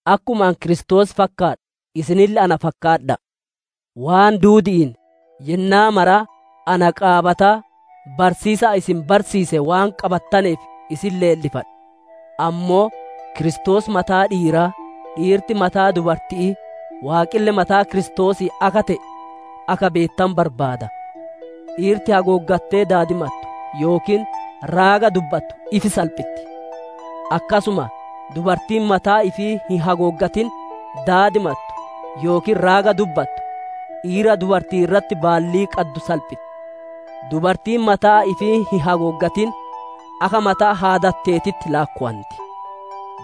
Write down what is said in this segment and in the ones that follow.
Akkuma ani Kiristoos fakkaadhu isinille na fakkaadha'a. Waan duudi'iin yennaa maraa na qaabataa, barsiisa ani isin barsiise waan qabattaneef isin leellifadha. Ammoo Kiristoos mataa dhiiraa, dhiirti mataa dubarti'ii, Waaqille mataa Kiristoosii akka te'e akka beettanu barbaada. Dhiirti hagooggattee daadimattu yookiin raaga dubbattu ifi salphitti. Akkasuma dubartiin mataa ifii hin hagooggatin daadimattu yookiin raaga dubbattu, dhiira dubartii irratti baallii qaddu salphitti. Dubartiin mataa ifii hin hagooggatin, akka mataa haadatteetitti laakkowanti.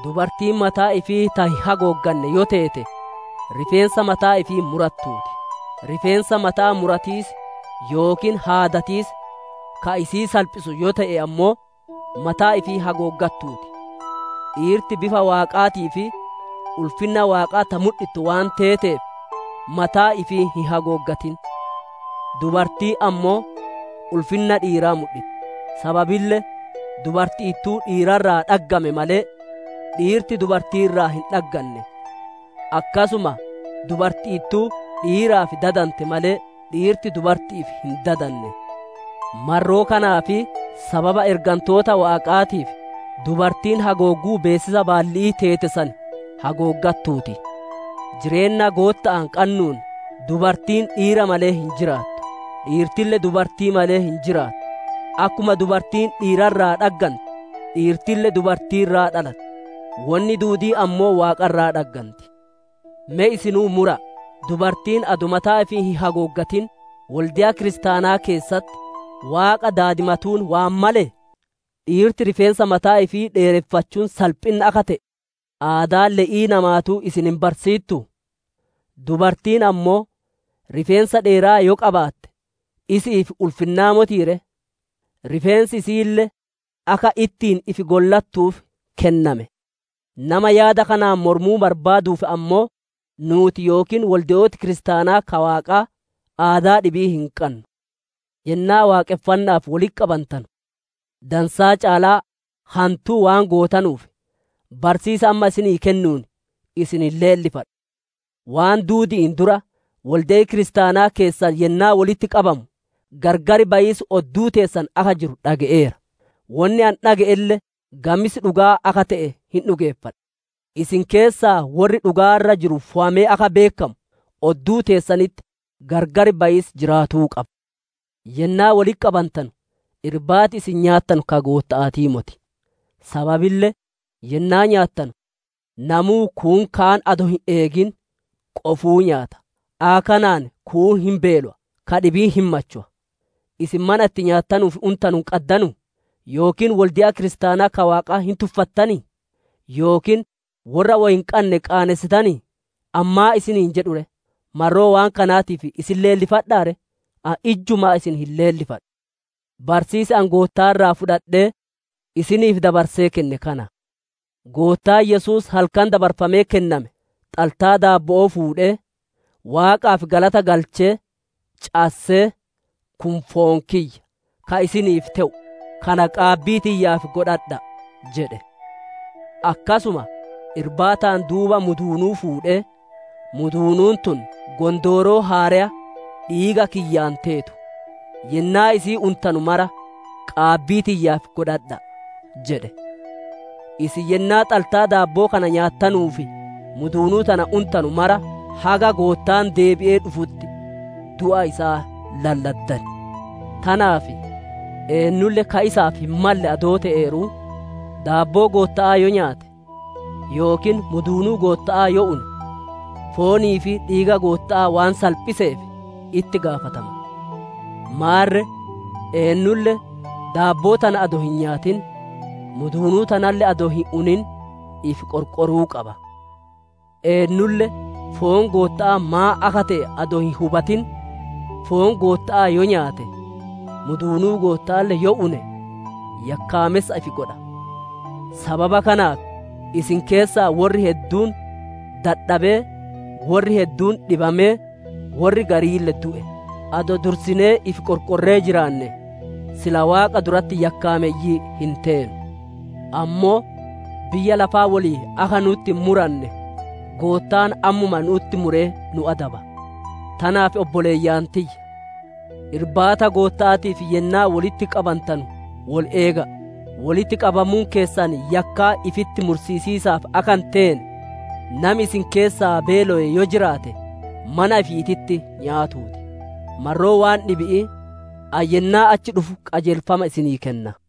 Dubartiin mataa ifii ta hin hagoogganne yoo teete, rifeensa mataa ifii murattuu ti; rifeensa mata'aa muratiis yookiin haadatiis ka isii salphisu yoo te'e ammoo, mataa ifii hagooggattuu ti. Dhiirti bifa Waaqaatii fi ulfinna Waaqaa ta mudhittu waan teeteef, mataa ifii hin hagooggatin. Dubartiin ammoo ulfinna dhiiraa mudhitti. Sababille dubarti'ittuu dhiira irraa dhaggame malee, dhiirti dubartii irraa hin dhagganne. Akkasuma dubarti'ittuu dhiiraaf dadante malee, dhiirti dubarti'iif hin dadanne. Marroo kanaa fi sababa ergantoota Waaqaatiif, dubartiin hagoogguu beessisa baalli'ii teete san hagooggatuu ti. Jireenna Gootta'aan qannuun dubartiin dhiira malee hin jiraattu; dhiirtille dubartii malee hin jiraattu. Akkuma dubartiin dhiira irraa dhaggante, dhiirtille dubartii irraa dhalatte; wonni duudiin ammoo Waaqa irraa dhagganti. Me isinuu mura'a; dubartiin adoo mataa ifii hin hagooggatin wolde'a kiristaanaa keessatti Waaqa daadimatuun waan malee? Dhiirti rifeensa mataa ifii dheereffachuun salphinna akka te'e, aadaan le'ii namaatuu isin hin barsiittuu? Dubartiin ammoo rifeensa dheeraa yoo qabaatte, isi'iif ulfinnaa motii ree? Rifeensi isi'iille akka ittiin ifi gollattuuf kenname. Nama yaada kanaan moromuu barbaaduuf ammoo, nuuti yookiin wolde'ooti kiristaanaa ka Waaqaa, aadaa dhibii hin qannu. Yennaa waaqonfanna'aaf wolitti qabantanu, dansaa caalaa hantuu waan gootanuuf, barsiisa amma isinii kennuun isin hin leellifadhu. Waan duudi'iin dura, wolde'i kiristaanaa keessan yennaa wolitti qabamu, gargar bayiisi odduu teessan akka jiru dhage'eera; wonni ani dhage'elle gamis dhugaa akka te'e hin dhugeeffadha. Isin keessaa worri dhugaa irra jiru fowamee akka beekkamu, odduu teessanitti gargar bayiisi jiraatuu qaba. Yennaa wolitti qabantanu Irbaati isin nyaattanu ka Gootta'aatii moti. Sababille yennaa nyaattanu namuu kuun kaan adoo hin eegin qofuu nyaata. Akka kanaan kuun hin beelowa, ka dhibiin hin machowa. Isin mana itti nyaattanuu fi untanu hin qaddanuu? Yookiin wolde'a kiristaanaa ka Waaqaa hin tuffattanii? Yookiin worra woy hin qanne qaanessitanii? Ani maan isiniin jedhu ree? Marroo waan kanaatiif isin leellifadhaa ree? Ani ijjumaa isin hin leellifadhu. Barsiisi ani Goottaa irraa fudhadhee isiniif dabarsee kenne kana: Goottaan Yesuus halkan dabarfamee kenname xaltaa daabbo'oo fuudhee, Waaqaaf galata galchee, cassee, «Kun foon kiyya, ka isiniif te'u; kana qaabbii tiyyaaf godhadha'a» jedhe. Akkasuma Irbaataan duuba muduunuu fuudhee, «Muduunuun tun gondooroo haareya dhiiga kiyyaan teetu; yennaa isii untanu mara qaabbii tiyyaaf godhadha'a» jedhe. Isin yennaa xaltaa daabbo'oo kana nyaattanuu fi muduunuu tana untanu mara, haga Goottaan deebi'ee dhufutti du'a isaa lalladdan. Tanaaf eennulle akka hin malleen, daabboo Gootta'aa yoo nyaate, yookiin muduunuu Gootta'aa yoo une, foonii fi dhiiga Gootta'aa waan salphiseef itti gaafatama. Maarre, eennulle daabboo tana adoo hin nyaatin, muduunuu tanalle adoo hin unin ifi qorqoruu qaba. Eennulle foon Gootta'aa maan akka te'e adoo hin hubatin, foon Gootta'aa yoo nyaate, muduunuu Gootta'aalle yoo une yakkaamessa ifi godha. Sababa kanaaf isin keessaa worri hedduun dadhabee, worri hedduun dhibamee, worri gariille du'e. Adoo dursinee ifi qorqorree jiraanne, sila Waaqa duratti yakkaameyyii hin teenu. Ammoo biyya lafaa woliin akka nu'utti hin muranne, Goottaan ammuma nu'utti muree nu adaba. Tanaaf obboleeyyan tiyya! Irbaata Gootta'aatiif yennaa wolitti qabantanu wol eega'a. Wolitti qabamuun keessan yakkaa ifitti mursiisiisaaf akka hin teene, nami isin keessaa beelaye yoo jiraate mana ifiititti nyaatuu ti. Marroo waan dhibi'ii ani yennaa achi dhufu, qajeelfama isinii kenna.